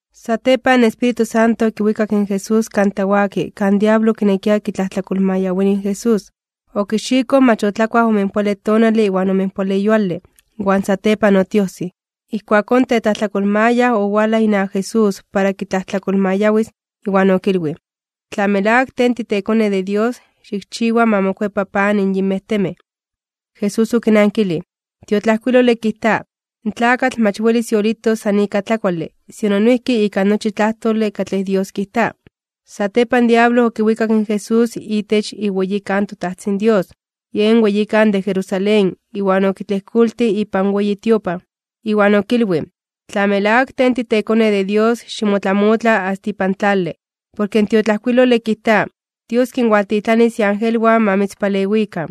Satepan, in Espíritu Santo okiwikak in Jesús kan tlawaki kan diablo okinekia kitlajtlakolmayawini in Jesús. Okixikoj mach otlakuaj omenpoale tonale iwan omenpoale yuale, iwan satepan otiojsij. Ijkuakón, in tetlajtlakolmayaj owalaj inawak Jesús para kitlajtlakolmayawis, iwan okilwij: ―Tla melawak Tej titeKone de Dios, xikchiwa ma mokuepa pan in yinmej temej. Jesús okinankilij: ―In tiotlajkuilole kijta: “In tlakatl mach welis yolitos san ika tlakuale, sino noijki ika nochi tlajtole katlej Dios kijta.” Satepan, in diablo okiwikak in Jesús itech iweyikan in toTajtzin Dios, yen weyikan de Jerusalén, iwan okitlejkoltij ipan weyi tiopan. Iwan okilwij: ―Tla melawak Tej titeKone de Dios, ximotlamotla asta ipan tlale. Porke in tiotlajkuilole kijta: Dios kinwaltitlanis iangelwan ma mitzpalewikan.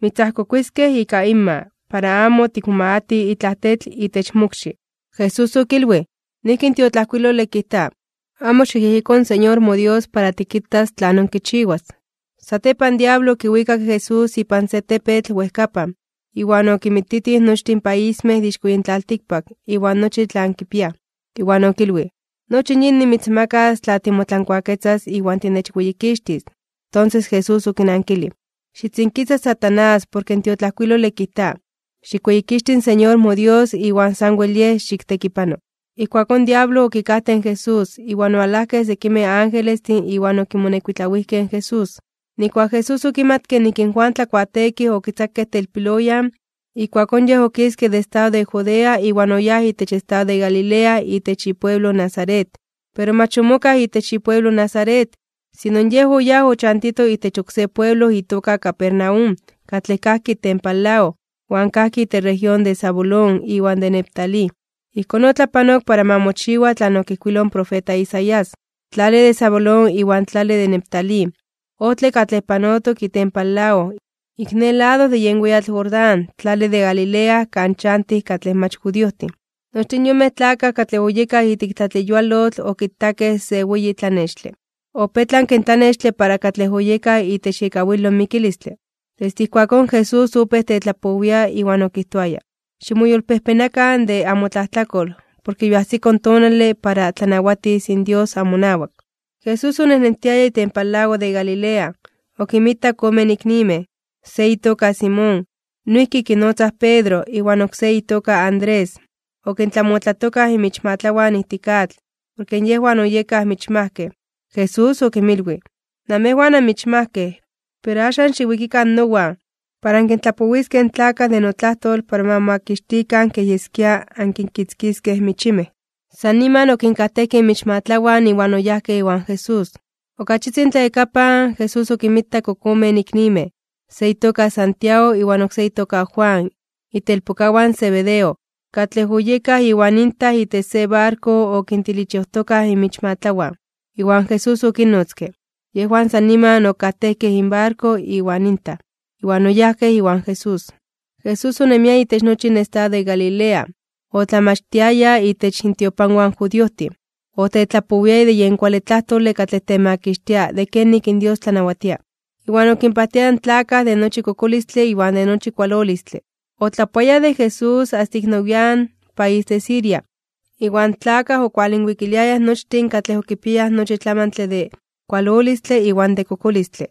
Mitzajkokuiskej ika inma, para amo tikmomagati itlaj tetl itech mokxi. Jesús okilwij: ―Noijki in tiotlajkuilole kijta: “Amo xikyejyeko in Señor moDios para tikitas tlanon kichiwas.” Satepan, in diablo okiwikak in Jesús ipan se tepetl wejkapan, iwan okinmititij nochtin paismej de ixko yin tlaltikpak, iwan nochi tlan kipiaj. Iwan okilwij: ―Nochi in yin nimitzmakas, tla timotlankuaketzas iwan tinechweyikixtis. Tonses, Jesús okinankilij: ―Xitzinkisa, Satanás, porke in tiotlajkuilole kijta: “Xikweyikixti in Señor moDios, iwan sanwel Yej xiktekipano.” Ijkuakón in diablo okikajtej in Jesús, iwan owalajkej sekimej angelestin iwan okimonekuitlawijkej in Jesús. Nijkuak Jesús okimatke nik in Juan Tlakuateekij okitzakej telpiloyan, ijkuakón Yej okiske de estado de Judea iwan oyáj itech estado de Galilea itech ipueblo Nazaret. Pero mach omokaj itech ipueblo Nazaret, sino yej oyáj ochantito itech oksé pueblo itoka Capernaum, katlej kajki itempan lago, iwan kajki itech región de Zabulón iwan de Neftalí. Ijkón otlapanok para ma mochiwa tlan okijkuiloj in profeta Isaías: Tlale de Zabulón iwan tlale de Neftalí, ojtle katlej panotok itempan lago, ik ne lado de yen weyatl Jordán, tlale de Galilea kan chantij katlej mach judiojtin. Nochtin yonmej tlakaj katlej oyekaj ijtik tlatleyualotl okitakej se weyi tlanextle. Opetlanke in tlanextle para katlej oyekaj itech iekawilo in mikilistle. Desde ijkuakón in Jesús opéj tetlapowia, iwan okijtoaya: ―Ximoyolpejpenakan (ximoyolkuepakan) de amotlajtlakol, porke yoajsiko in tonale para tlanawatis in Dios amonawak. Jesús onejnentiaya itempan lago de Galilea. Okinmitak omen iknimej: Se itoka Simón, noijki kinotzaj Pedro, iwan oksé itoka Andrés. Okintlamotlatokaj inmichmatlawan ijtik atl, porke yejwan oyekaj michmajkej. Jesús okinmilwij: ―Namejwan anmichmajkej. Pero axan xiwikikan nowan, para ankintlapowiskej in tlakaj de notlajtol para ma momakixtikan kej yeskia ankinkitzkiskej michimej. San niman okinkajtejkej inmichmatlawan iwan oyajkej iwan Jesús. Ok achitzin tlayakapan, Jesús okinmitak ok omen iknimej: Se itoka Santiago iwan oksé itoka Juan, itelpokawan in Zebedeo, katlej oyekaj iwan intaj itech se barko okintilichojtokaj inmichmatlawan. Iwan Jesús okinnotzke. Yejwan san niman okajtejkej inbarko iwan intaj, iwan oyajkej iwan Jesús. Jesús onemia itech nochi in estado de Galilea, otlamachtiaya itech intiopanwan in judiojtin. Otetlapowiaya de yen kuale tlajtole katlej temakixtia de kenik in Dios tlanawatia. Iwan okinpajtiaya in tlakaj de nochi kokolistle iwan de nochi kualolistle. Otlapoayaj de Jesús asta ik nowian (nian nepa) país de Siria. Iwan tlakaj okinwalwikiliayaj nochtin katlej okipiayaj nochi tlamantle de kualolistle iwan de kokolistle,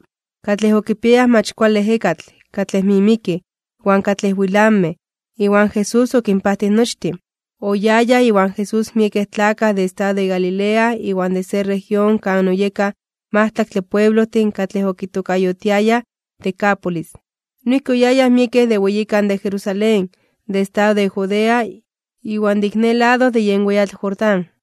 katlej okipiayaj mach kuale ejekatl, katlej mimikij, iwan katlej wilanmej (temetlamej). Iwan Jesús okinpajtij nochtin. Oyayaj iwan Jesús miekej tlakaj de estado de Galilea iwan de se región kan oyekaj majtlaktle pueblojtin katlej okitokayotiayaj Decápolis. Noijki oyayaj miekej de weyikan de Jerusalén, de estado de Judea, iwan de ik ne lado de yen weyatl Jordán.